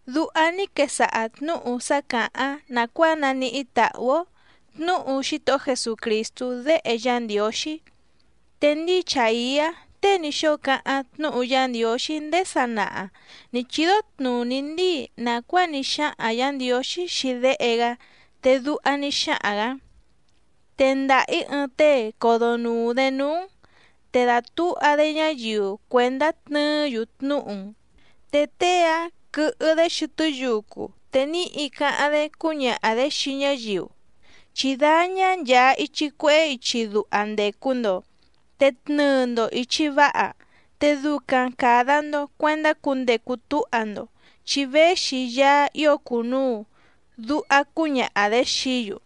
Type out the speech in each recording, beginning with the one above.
Duha ní quesaha tnǔhu sá càháⁿ nàcuáa naníhí tàhú‑ó tnǔhu Xítohó Jesucrìstú Déhe Yá Ndiǒxí. Te ndíi Chàiá tée ní xóo cáháⁿ tnúhu Yá Ndiǒxí ndéé sanaha nǐ chídó tnùní ndíi nàcuáa ní xáhaⁿ Yǎ Ndiǒxí xii Déhe‑gá, te duha ní xáhaⁿ‑gǎ: Tendaha‑ǐ ɨɨⁿ tée codonùu‑dé núú‑n, te dàtúha‑dé ñáyiu cuèndá tnɨɨ́‑yu tnúhu‑n. Te tée‑áⁿ quɨhɨ‑dé xɨtɨ́ yucu te níhi cáháⁿ‑dé cúñaha‑dě xii ñáyiu: “Chí dáñá nchàa ichi cuehé ichi duha ndècu‑ndo, te tnɨɨ‑ndo ìchi váha, te ducaⁿ càda‑ndo cuendá cundecu túha‑ndo, chi véxi Yaá ío cùnuu”, duha cúñaha‑dě xií‑yu.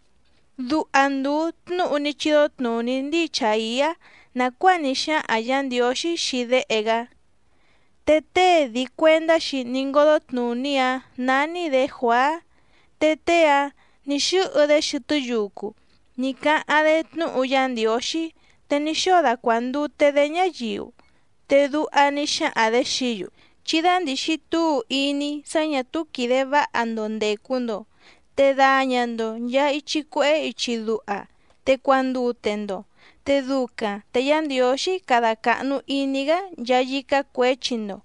Duha ndùu tnúhu ní chídó tnùní ndíi Chàiá nàcuáa ní xáhaⁿ Yǎ Ndiǒxí xii Déhe‑gá. Te tée dii cuèndá‑xi ní ngódó tnùní‑áⁿ nání‑dě Juàá, te tée‑áⁿ nǐ xɨ́hɨ‑dé xɨtɨ́ yucu ní cáháⁿ‑dé tnúhu Yá Ndiǒxí, te ní xóo dacuàndute‑dé ñáyiu, te duha ní xáhaⁿ‑dě xií‑yu: —Chí dándìxi túu iní sá ñà túú quìde váha‑ndo ndècu‑ndo, te daña‑ndo nchàa ichi cuehé ichi duha te cuandute‑ndo, te ducaⁿ te Yá Ndiǒxí cada càhnu iní‑gá nchaa yícá cuěchi‑ndo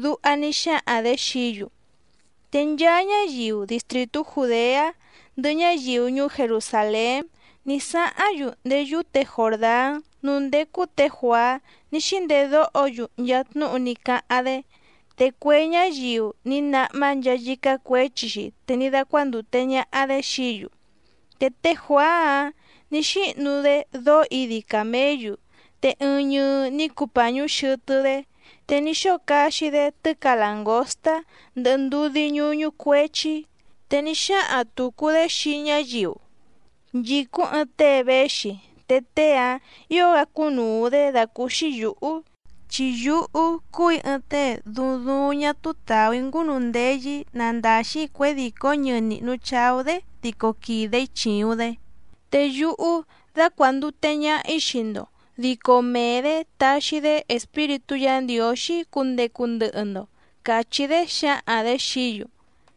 —duha ní xáhaⁿ‑dě xií‑yu. Te nchaa ñáyiu distrìtú Jùdeá, ndɨhɨ ñáyiu ñuú Jerusàlén ní sáháⁿ‑yu ndéé yúte Jòrdán núú ndécú tě Juàá ní xíndedóho‑yu nchaa tnúhu ní cáháⁿ‑dé. Te cue ñáyiu ní náhmá nchaa yícá cuěchi‑xi te ní dácuándùte ñaha‑dé xií‑yu. Te té Juàá‑áⁿ nǐ xíhnu‑dé dóó idi càméyu, te ɨɨⁿ ñɨɨ ní cuu pàñú xɨtɨ́‑dé, te ní xóo caxi‑dé tɨ́ca làngóstá ndɨhɨ ndudí ñúñú cuéchí. Te ní xáhaⁿ tùcu‑dé xii ñáyiu: —Nchìcúⁿ ɨɨⁿ tée véxi, te tée‑áⁿ ǐo‑gá cúnùu‑dé dàcúúxí yǔhú, chi yúhú cúù‑í ɨɨⁿ tée duuⁿ duuⁿ ñá túú tàú‑í ngúnundeyɨ‑í nandaxi cuědìcó ñɨɨ nihnu chàú‑dé dico quìde‑í chìuⁿ‑dé. Te yúhú dácuàndute ñaha‑í xii‑ndo, dico mee‑dě taxi‑dé Espíritú Yǎ Ndiǒxí cundecu ndɨhɨ‑ndo —càchí‑dé xǎhaⁿ‑dě xií‑yu.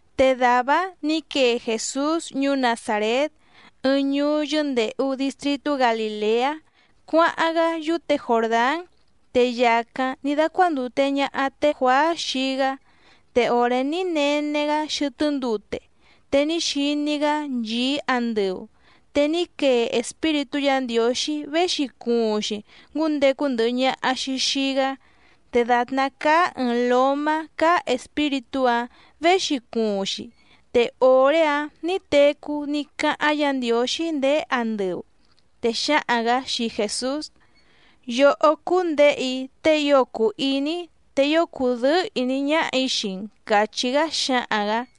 Te dàvá‑áⁿ nǐ quee Jèsús ñuú Nazàrét ɨɨⁿ ñuú yɨ́ndèhu distritú Galìleá cuáháⁿ‑gá yúte Jòrdán. Te yàcáⁿ ní dácuándùte ñaha té Juàá xii‑gá. Te òré ní nene‑gá xɨtɨ́ ndute, te ní xiní‑gá nchìí andɨu, te ní quee Espíritú Yǎ Ndiǒxí véxi cuuⁿ‑xi ngúndecu ndɨhɨ ñaha‑xi xìi‑gá, te dàtná cáá ɨ̀ɨⁿ lómá cáá Espíritú‑áⁿ věxi cuuⁿ‑xi. Te òré‑áⁿ nǐ tecú ní cáháⁿ Yǎ Ndiǒxí ndéé andɨu, te xǎhaⁿ‑gǎ xii Jèsús: —Yòhó cúú‑n Děhe‑í tée ío cùu iní‑í te ío cùdɨ́ɨ́ ìní ñáhà‑í xii‑n —càchí‑gá xǎhaⁿ‑gǎ.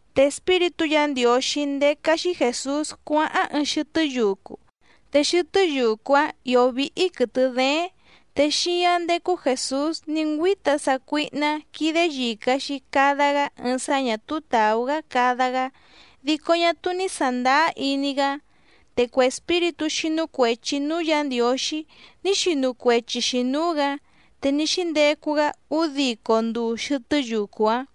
Te Espíritú Yǎ Ndiǒxí ndécá‑xí Jèsús cuáháⁿ ɨɨⁿ xɨtɨ́ yucu. Te xɨtɨ́ yucu‑áⁿ ìó víhí quɨ̀tɨ dééⁿ, te xíáⁿ ndécú Jèsús ní ngüíta sácuíhná quídé yìca‑xi cada‑gá ɨɨⁿ sá ñà túú tàú‑gá cada‑gá dico ñá túú ní sàndáá iní‑gá. Te cue espíritú xínú cuèchi núú Yǎ Ndiǒxí ní xinu cuechi‑xi nǔú‑gǎ. Te ní xíndecu‑gá údico nduu xɨtɨ́ yucu‑áⁿ.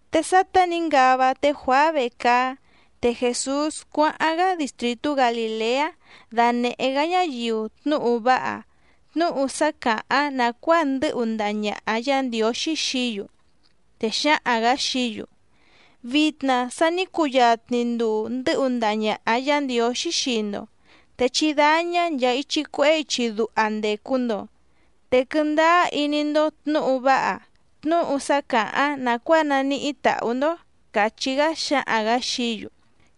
Te sátá nǐ ngava té Juàá vecaá, te Jèsús cuáháⁿ‑gá distrìtú Galìleá dànehé‑gá ñáyiu tnúhu váha, tnúhu sá càháⁿ nàcuáa ndɨ́hu ndaha ñàha Yá Ndiǒxí xií‑yu. Te xǎhaⁿ‑gǎ xií‑yu: —Vitna sa ní cuyatni nduu ndɨ̌hu ndaha ñàha Yá Ndiǒxí xii‑ndo, te chí dáñá nchàa ichi cuehé ichi duha ndècu‑ndo, te quɨndáá iní‑ndó tnǔhu váha, tnúhu sá càháⁿ nàcuáa naníhí tàhú‑ndó —càchí‑gá xǎhaⁿ‑gǎ xií‑yu.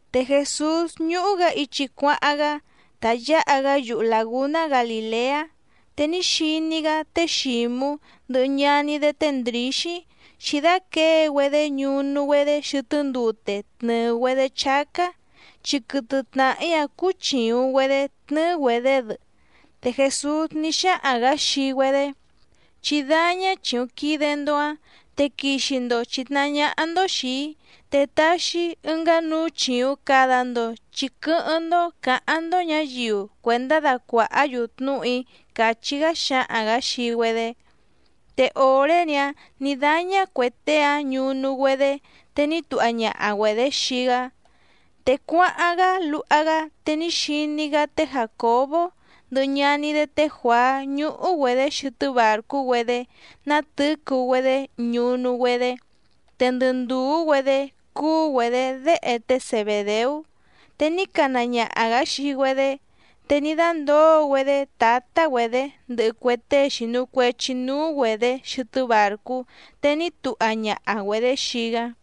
Te Jèsús ñúhú‑gǎ ichi cuáháⁿ‑gá tá yǎha‑gá yuhu làgúná Galìleá, te ní xiní‑gá té Xǐmú ndɨhɨ ñaní‑dé té Ndrǐxí xǐdáquěe‑güedé ñunu‑güedé xɨtɨ́ ndute tnɨ̀ɨ‑güedé chácá, chi quɨtɨ tnàhí‑áⁿ cúú chìuⁿ‑güedé tnɨ́ɨ́‑güedě‑dɨ. Te Jèsús ní xáhaⁿ‑gǎ xii‑güedé: —Chí dáñá chìuⁿ quide‑ndo‑áⁿ, te quixi‑ndo chìtnahá ñáhá‑ndó xìi‑í te taxi‑í ɨngá núú chìuⁿ cada‑ndo chi quɨ́hɨ́ⁿ‑ndó cǎháⁿ‑ndó ñǎyiu cuèndá dacuàhá‑yu tnúhu‑í —càchí‑gá xǎhaⁿ‑gǎ xii‑güedé. Te òré‑ni‑áⁿ nǐ dáñá cuè tée‑áⁿ ñunu‑güedé te ní tuha ñaha‑güedě xii‑gá. Te cuáháⁿ‑gá luha‑gá, te ní xiní‑gá té Jàcobó ndɨhɨ ñaní‑dé té Juàá ñúhú‑güedě xɨtɨ́ bàrcú‑güedé nátɨ̌cu‑güedé ñunu‑güedé, te ndɨ ndùú‑güedé cúú‑güedě déhe té Zebèdeú. Te ní cana ñaha‑gǎ xii‑güedé, te ní dándǒo‑güedé tǎtá‑güedě ndɨhɨ cue tée xìnu cuechi núú‑güedě xɨtɨ́ bàrcú, te ní tuha ñaha‑güedě xii‑gá.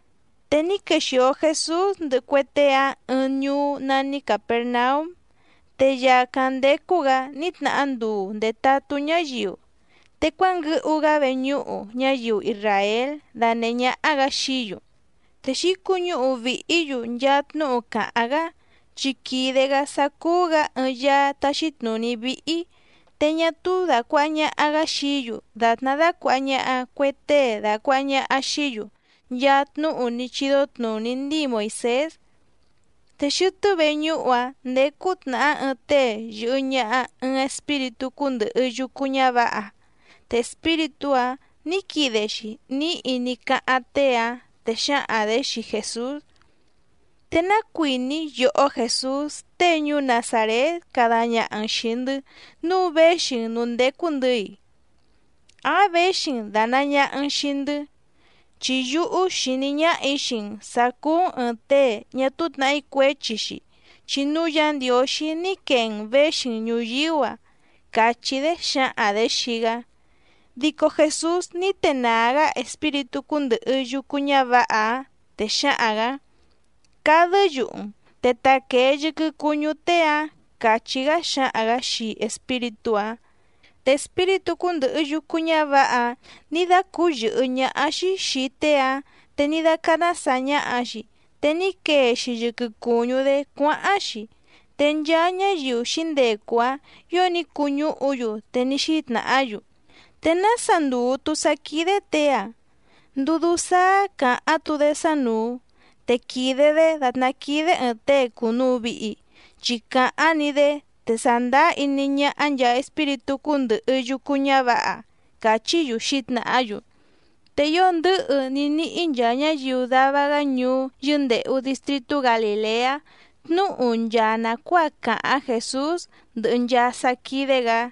Te ní quexìo Jesús ndɨhɨ cue tée‑áⁿ ɨɨⁿ ñuú nání Càpernaúm, te yàcáⁿ ndécú‑gǎ ní tnahá nduu ndètatú ñáyiu, te cuánguɨhu‑gá veñúhu ñáyiu isràél dànehé ñáhá‑gǎ xií‑yu. Te xǐcuñúhu vìhí‑yu nchaa tnúhu càháⁿ‑gá, chi quìde‑gá sá cúú‑gǎ ɨɨⁿ Yaá táxí tnùní víhí, te ñá túú dàcuaha ñaha‑gá xií‑yu dàtná dácuàha ñaha cue tée dàcuaha ñaha xií‑yu nchaa tnúhu ní chídó tnùní ndíi Moìsés. Te xɨtɨ́ veñúhu‑áⁿ ndécú tnàhá ɨɨⁿ tée yɨ̀hɨ ñaha ɨɨⁿ espíritú cúndɨ̀hɨ yucu ñávǎha, te espíritú‑áⁿ nǐ quide‑xi níhi ní cáháⁿ tée‑áⁿ, te xǎhaⁿ‑dě xii Jèsús: —¿Te ná cuìní yòhó Jèsús tée ñuú Nazàrét cada ñaha‑n xìi‑ndɨ́ nǔu véxi‑n nǔú ndécú‑ndɨ̌‑i? ¿Áⁿ věxi‑n dànaa ñaha‑n xii‑ndɨ́? Chi yúhú xìní ñáhà‑í xii‑n sǎ cúú‑n ɨ̀ɨⁿ tée ñá túú tnàhí cuéchi‑xi, chi núú Yǎ Ndiǒxí ní quee‑n věxi‑n ñùyíú‑a —càchí‑dé xǎhaⁿ‑dě xii‑gá. Dico Jèsús ní tenàá‑gá espíritú cúndɨ̀hɨ yucu ñávǎha‑áⁿ, te xǎhaⁿ‑gǎ: —¡Cadɨ́ yuhu‑n, te taquèe yɨquɨ cuñú tée‑áⁿ! —càchí‑gá xǎhaⁿ‑gǎ xii espíritú‑áⁿ. Te espíritú cúndɨ̀hɨ yucu ñávǎha‑áⁿ nǐ dácǔyɨ̀hɨ́ ñáhá‑xí xìi tée‑áⁿ, te ní dácáná sàa ñaha‑xi, te ní quee‑xi yɨquɨ cùñú‑dé cuáháⁿ‑xi. Te nchaa ñáyiu xǐndecu‑áⁿ ǐo ní cuñúhu‑yu, te ní xítnàhá‑yu: —¿Te nása ndùu‑tu sá quídé těe‑a? ¿Ndudú sáá càháⁿ‑tu‑dé sánùu? Te quìde‑dé dàtná quídé ɨ̀ɨⁿ tée cùnuu vihi, chi càháⁿ‑ni‑dé te sàndáá iní ñáhá nchàa espíritú cúndɨ̀hɨ yucu ñávǎha —càchí‑yu xǐtnàhá‑yu. Te ío ndɨ̌hɨ ní níhí nchaa ñáyiu dava‑gá ñuú yɨ́ndèhu distritú Galìleá tnúhu nchaa nàcuáa càháⁿ Jèsús ndɨhɨ nchaa sá quídé‑gǎ.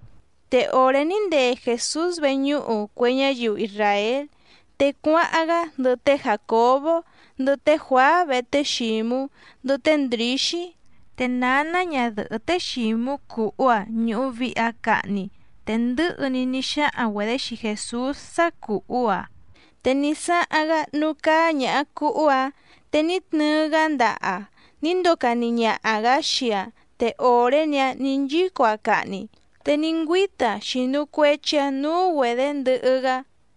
Te òré ní ndee Jèsús veñúhu cue ñáyiu isràél, te cuáháⁿ‑gá ndɨhɨ té Jàcobó ndɨhɨ té Juàá vehe té Xǐmú ndɨhɨ té Ndrǐxí. Te nǎná ñadɨ̀hɨ́ té Xǐmú cùhú‑aⁿ ñùhu vihi‑aⁿ cahni, te ndɨ̌hɨ‑ni ní xáhaⁿ‑güedě xii Jèsús sá cùhú‑aⁿ. Te ní sáháⁿ‑gá núú cáá ñàha cuhú‑áⁿ te ní tnɨɨ‑gá ndaha‑aⁿ ní ndocani ñaha‑gǎ xii‑aⁿ. Te òré‑ni‑áⁿ nǐ nchíco‑aⁿ cahni, te ní ngüíta‑aⁿ xìnu cuechi‑aⁿ núú‑güedě ndɨhɨ‑gá.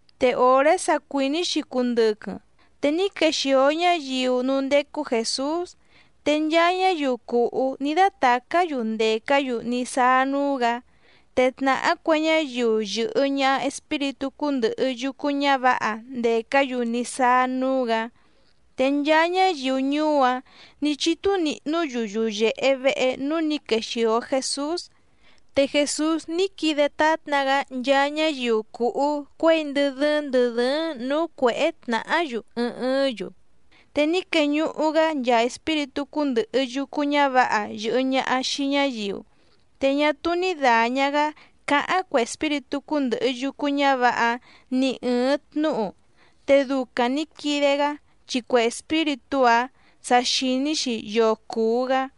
Te òré sa cuìní‑xi cundɨquɨⁿ te ní quexìo ñáyiu núú ndécú Jèsús, te nchaa ñáyiu cùhú ní dátàcá‑yu ndècá‑yu ní sáá núú‑gǎ, te tnàhá cue ñáyiu yɨ̀hɨ ñaha espíritú cúndɨ̀hɨ yucu ñávǎha ndècá‑yu ní sáá núú‑gǎ. Te nchaa ñáyiu ñuú‑áⁿ nǐ chítú níhnǔ‑yu yuyèhe vehe núú nǐ quexìo Jesús. Te Jèsús ní quide tátna‑gá nchaa ñáyiu cùhú cuěi ndɨ dɨ́ɨ́ⁿ ndɨ̀ dɨ́ɨ́ⁿ nǔú cuěhé tnàhá‑yu ɨɨⁿ ɨɨ́ⁿ‑yu, te ní queñuhu‑gá nchaa espíritú cúndɨ̀hɨ yucu ñávǎha yɨ̀hɨ ñaha xii ñáyiu, te ñá túú ní dàña‑gá cáháⁿ cue espíritú cúndɨ̀hɨ yucu ñávǎha‑áⁿ ni ɨ̀ɨⁿ tnúhu, te ducaⁿ nǐ quide‑gá chi cue espíritú‑áⁿ sa xìní‑xi yoo cùu‑gá.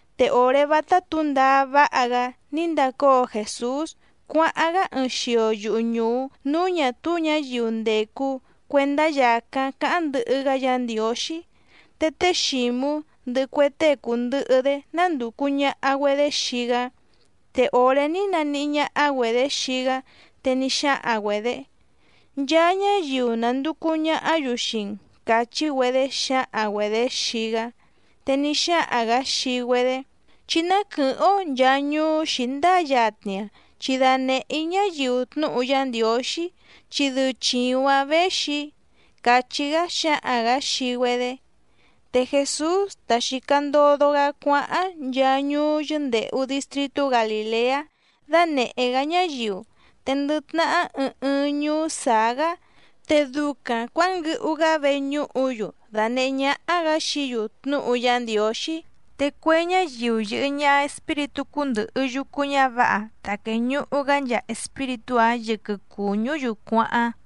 Te òré vátá tǔndaá váha‑gá ní ndacóo Jèsús cuáháⁿ‑gá ɨɨⁿ xio yuhu ñùú núú ñà túú ñǎyiu ndècu cuendá yàcáⁿ cáháⁿ ndɨhɨ‑gá Yǎ Ndiǒxí. Te té Xǐmú ndɨhɨ cue tée cùndɨhɨ‑dé nándùcu ñaha‑güedé xii‑gá. Te òré ní naníhí ñáhá‑güedě xii‑gá, te ní xáhaⁿ‑güedě: —Nchaa ñáyiu nànducu ñahá‑yu xii‑n —càchí‑güedé xǎhaⁿ‑güedě xii‑gá. Te ní xáhaⁿ‑gǎ xii‑güedé: —Chí ná quɨ̀hɨ́ⁿ‑ó nchàa ñuú xǐndáa yatni‑a, chi danèhé‑í ñáyiu tnúhu Yá Ndiǒxí chi dɨu chìuⁿ‑áⁿ věxi‑í —càchí‑gá xǎhaⁿ‑gǎ xii‑güedé. Te Jèsús tá xìca ndodo‑gá cuáháⁿ nchaa ñuú yɨ́ndèhu distritú Galìleá dánèhé‑gá ñáyiu, te ndɨ tnahá ɨɨⁿ ɨɨⁿ ñuú sàá‑gá te ducaⁿ cuǎnguɨhu‑gá veñúhu‑yu dànehé ñáhá‑gǎ xií‑yu tnúhu Yá Ndiǒxí, te cue ñáyiu yɨ̀hɨ ñaha espíritú cúndɨ̀hɨ yucu ñávǎha ta quèñuhu‑gá nchaa espíritú‑áⁿ yɨquɨ cùñú‑yu cuáháⁿ.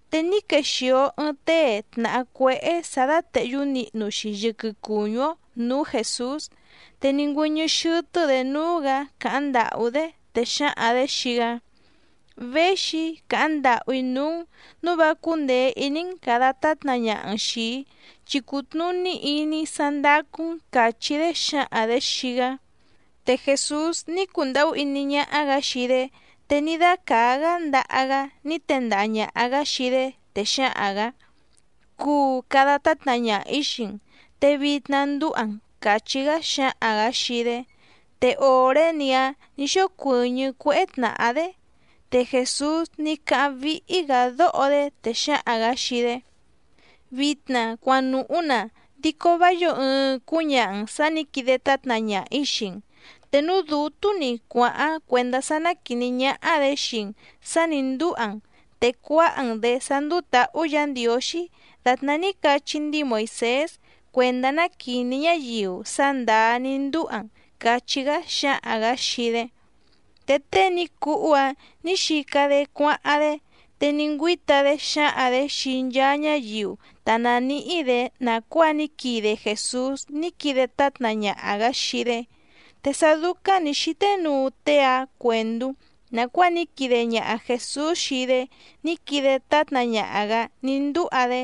Te ní quexìo ɨɨⁿ tée tnàhá cuéhé sǎ dátèhyú nihnu‑xi yɨquɨ cùñú‑ó nǔú Jèsús, te ní ngüɨ́ñɨ́ xɨ́tɨ́‑dě núú‑gǎ càháⁿ ndàhú‑dé, te xǎhaⁿ‑dě xii‑gá: —Véxi‑í càháⁿ ndàhú‑í núú‑n nǔu vá cúndèe iní‑n càda tátna ñaha‑n xìi‑í chi cùtnuní iní‑í sá ndácú‑n —càchí‑dé xǎhaⁿ‑dě xii‑gá. Te Jèsús ní cundàhú iní ñáhá‑gǎ xii‑dé te ní dácàá‑gá ndaha‑gá ní tendaha ñàha‑gá xii‑dé, te xǎhaⁿ‑gǎ: —Cuu cada tátna ñaha‑ǐ xii‑n, te vitna ndúha‑n —càchí‑gá xǎhaⁿ‑gǎ xii‑dé. Te òré‑ni‑áⁿ nǐ xócuɨ̀ñɨ́ cuéhé tnàhá‑dé. Te Jèsús ní cáháⁿ víhí‑gǎ dóho‑dé, te xǎhaⁿ‑gǎ xii‑dé: —Vitna cuanùhú‑na, dico vá yǒo ɨɨⁿ cúñaha‑n sà ní quide tátna ñaha‑ǐ xii‑n, te núú dǔtú‑ni cuàháⁿ cuèndá sá ná quìní ñáhá‑dě xii‑n sà ní ndúha‑n te cuáha‑n‑dě sá ndúú tǎhú Yǎ Ndiǒxí dàtná ní cachí ndíi Moìsés cuèndá ná quìní ñáyiu sá ndàá ní ndúha‑n —càchí‑gá xǎhaⁿ‑gǎ xii‑dé. Te tée ní cuhú‑áⁿ nǐ xica‑dé cuáháⁿ‑dé, te ní ngüíta‑dé xǎhaⁿ‑dě xii nchaa ñáyiu ta nàníhí‑dě nàcuáa ní quide Jèsús ní quide tátna ñaha‑gǎ xii‑dé. Te sá dúcáⁿ nǐ xíté nuu tée‑áⁿ cuèndú nàcuáa ní quide ñaha Jèsús xii‑dé ní quide tátna ñaha‑gǎ ní ndúha‑dé,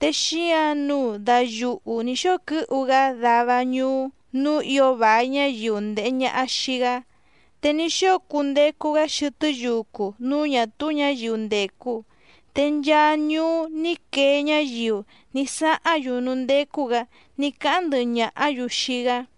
te xíǎⁿ nǔu dayuhu nǐ xóo quɨ́hu‑gá dava ñuú núú ǐo vài ñáyiu ndèhe ñaha xii‑gá, te ní xóo cundecu‑gá xɨtɨ́ yucu núú ñà túú ñǎyiu ndècu. Te nchaa ñuú ní quee ñáyiu ní sáháⁿ‑yu núú ndécú‑gǎ ní cáháⁿ ndɨhɨ ñàhá‑yu xii‑gá.